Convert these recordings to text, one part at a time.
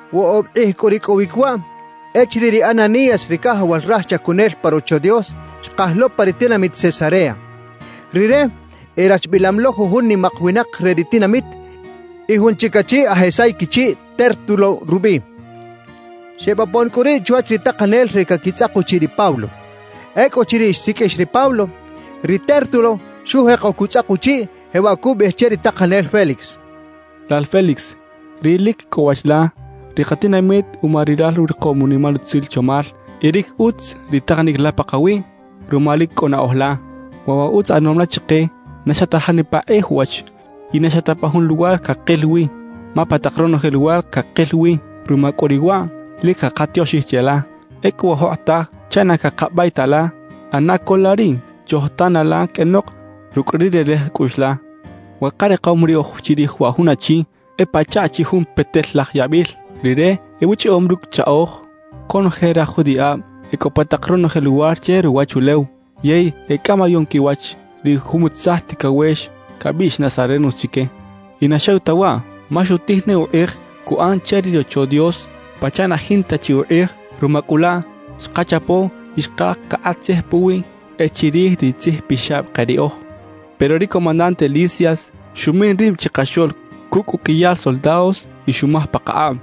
Woꞌob kꞌij cꞌu ricꞌowic waꞌ echiriꞌ ri Ananías ri cajawal raj chacunel pa Rocho Dios xkaj lo pa ri tinamit Cesarea. Rire erachbilam lo jujun nimak winak re ri tinamit y jun chic achi aj esay quichiꞌ, Tértulo rubiꞌ. Xebopon cꞌu riꞌ chwach ri takanel re caquitzꞌak uchiꞌ ri Pablo. Ecꞌuchiriꞌ xsiqꞌuix ri Pablo, ri Tértulo xujeko cutzꞌak uchiꞌ, jewaꞌ cubiꞌij che ri takanel Félix: «Lal Félix ri lic cꞌo wach la, ri katinamit uma rilal urikom unimal utzil chomal y lic utz ri takanic la pakawiꞌ ruma lic cꞌo naꞌoj la. Waꞌ wa utz ꞌanom la chike na xa ta janipa kꞌij uwach y na xa ta pa jun luwar cakil wi, ma pa tak ronoje luwar cakil wi. Ruma cꞌu riꞌ waꞌ, lic cakatioxij cheꞌla. »Ecꞌu wa jokꞌotaj, chaꞌ na cakabay ta la, ꞌana co la riꞌ chojtana la qꞌuenok rucꞌ ri relej cꞌuꞌx la. »Wa karikom riꞌoj chirij wa jun achi e pachaꞌ chi jun petel-laj yabil. Rire ebuchꞌiꞌom rucꞌ chꞌaꞌoj conoje raj judiꞌab e cꞌo pa tak ronoje luwar che ruwachulew. Yey e cꞌamayom quiwach ri jumutzaj ticawex cabiꞌx “nazarenos” chique. Y na xew ta waꞌ, ma xutij ne ukꞌij cuꞌan che ri Rocho Dios pachaꞌ na jinta chi ukꞌij. Ruma cꞌu laꞌ, xkachapo y xkaj cakꞌat tzij puwiꞌ e chirij ri tzijpixab ke riꞌoj. »Pero ri comandante Lisias xumin rib chikaxoꞌl cucꞌ uqꞌuiyal soldados y xumaj pakakꞌab.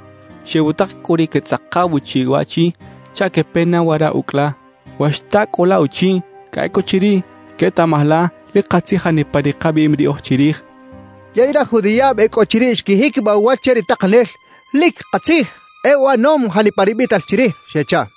Xebutak cꞌu ri quetzꞌakaw uchiꞌ waꞌchi chaꞌ quepe na wara ucꞌ la. We xta cꞌu la uchiꞌ, cꞌa ecꞌuchiriꞌ quetaꞌmaj la lic katzij janipa ri kabiꞌim riꞌoj chirij» xchaꞌ. Yey raj judiꞌab e cꞌo chiriꞌ xquijiquibaꞌ uwach che ri takanel: «Lic katzij; e uꞌanom janipa ri biꞌtal chirij» xechaꞌ.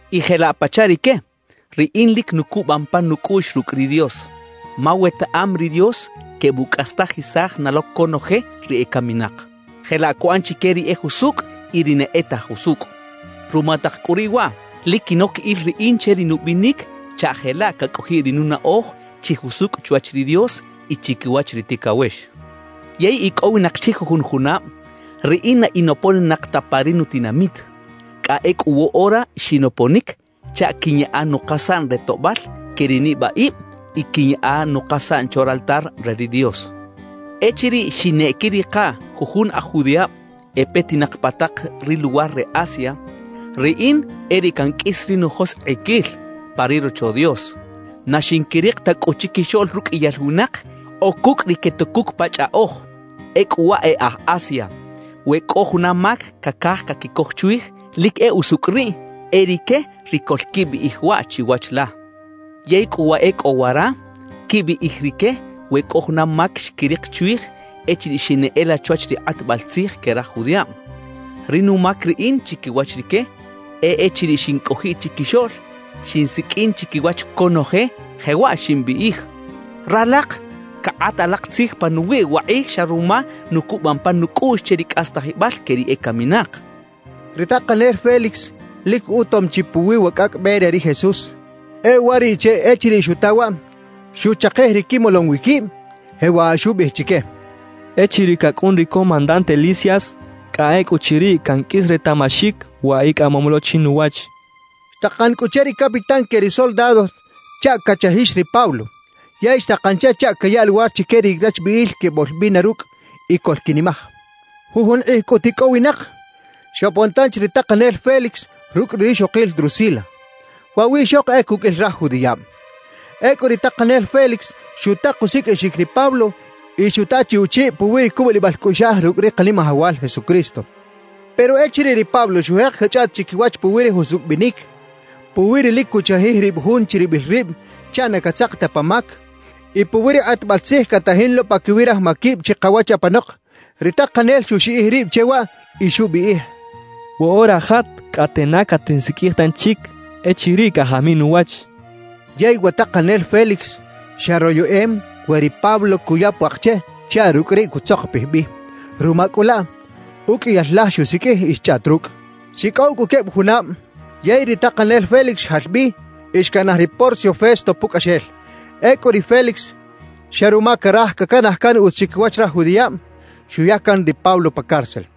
Y jelaꞌ pachaꞌ rique, riꞌin lic nucubam pan nucꞌuꞌx rucꞌ ri Dios. Ma wetaꞌam ri Dios quebucꞌastajisaj na lo conoje ri ecaminak; jelaꞌ cuꞌan chique ri e jusucꞌ y ri na e ta jusucꞌ. Ruma tak cꞌu riꞌ waꞌ, lic quinoc il riꞌin che ri nubinic chaꞌ jelaꞌ cacꞌojiꞌ ri nunaꞌoj chi jusucꞌ chwach ri Dios y chiquiwach ri ticawex. »Yey icꞌowinak chi jujun junab riꞌin na in oponinak ta pa ri nutinamit; cꞌa ecꞌu woꞌora xinoponic chaꞌ quiꞌnyaꞌa nukasaꞌn re toꞌbal que ri nibaꞌib y quiꞌnyaꞌa nukasaꞌn chwa raltar re ri Dios. »Echiriꞌ xineꞌquirika jujun aj judiꞌab e petinak pa tak ri luwar re Asia, riꞌin e riꞌ canqꞌuis ri nujoskꞌiquil pa ri Rocho Dios. Na xinquirik ta cꞌu chiquixoꞌl ruqꞌuiyal winak o cucꞌ ri quetucuc pa chꞌaꞌoj. Ecꞌu wa e aj Asia, we cꞌo juna mac cacaj caquicoj chwij, lic e usucꞌ riꞌ e rique ri coꞌlquibiꞌij waꞌ chiwach la. »Yey cꞌu wa e cꞌo wara, quibiꞌij rique we cꞌo juna mac xquirik chwij echiriꞌ xineꞌela chwach ri kꞌatbal tzij que raj judiꞌab. Ri numac riꞌin chiquiwach rique, e echiriꞌ xincꞌojiꞌ chiquixoꞌl, xinsiqꞌuin chiquiwach conoje, jewaꞌ ximbiꞌij: “Ralak cakꞌat alak tzij panuwiꞌ wakꞌij xa ruma nucubam pan nucꞌuꞌx che ri cꞌastajibal que ri ecaminak”» xcha ri Pablo. Ri takanel Félix lic utom chi puwi wa Cꞌacꞌ Be re ri Jesús. E uwariꞌche echiriꞌ xuta waꞌ, xuchakij ri quimolom wi quib, jewaꞌ xubiꞌij chique: «Echiriꞌ cacꞌun ri comandante Lisias, cꞌa ecꞌuchiriꞌ canqꞌuis retaꞌmaxic wa icꞌamom lo chinuwach» xchaꞌ. Xtakan cꞌu che ri capitán que ri soldados chaꞌ cachajix ri Pablo, yey xtakan che chaꞌ cayaꞌ luwar chique ri rachbiꞌil queboꞌlbina rucꞌ y coꞌlquinimaj. Jujun kꞌij cꞌut icꞌowinak, xopon tanchi ri takanel Félix rucꞌ ri rixokil Drusila; waꞌ wiꞌxok e cuqꞌuil raj judiꞌab. Ecꞌu ri takanel Félix xutak usiqꞌuixic ri Pablo y xuta chi uchiꞌ puwi ri cubulibal cꞌuꞌxaj rucꞌ ri Kanimajawal Jesucristo. Pero echiriꞌ ri Pablo xujek cachꞌaꞌt chiquiwach puwi ri jusucꞌ binic, puwi ri lic cuchajij rib jun chiribil rib chaꞌ na catzak ta pa mac y puwi ri kꞌatbal tzij catajin lo paquiwi raj maquib chikawach apanok, ri takanel xuxiꞌij rib che waꞌ y xubiꞌij: «Woꞌora jat, cꞌate na catinsiqꞌuij tanchic echiriꞌ cajamiꞌ nuwach» xchaꞌ. Yey wa takanel Félix xa royeꞌem we ri Pablo cuya puak che chaꞌ rucꞌ riꞌ cutzokopij bi. Ruma cꞌu laꞌ, uqꞌuiyal laj xusiqꞌuij y xchꞌaꞌt rucꞌ. Xicꞌow cꞌu queb junab, yey ri takanel Félix xjal bi y xcanaj ri Porcio Festo pucꞌaxel. Ecꞌu ri Félix, xa ruma caraj cacanaj can utz chiquiwach raj judiꞌab, xuya can ri Pablo pa cárcel.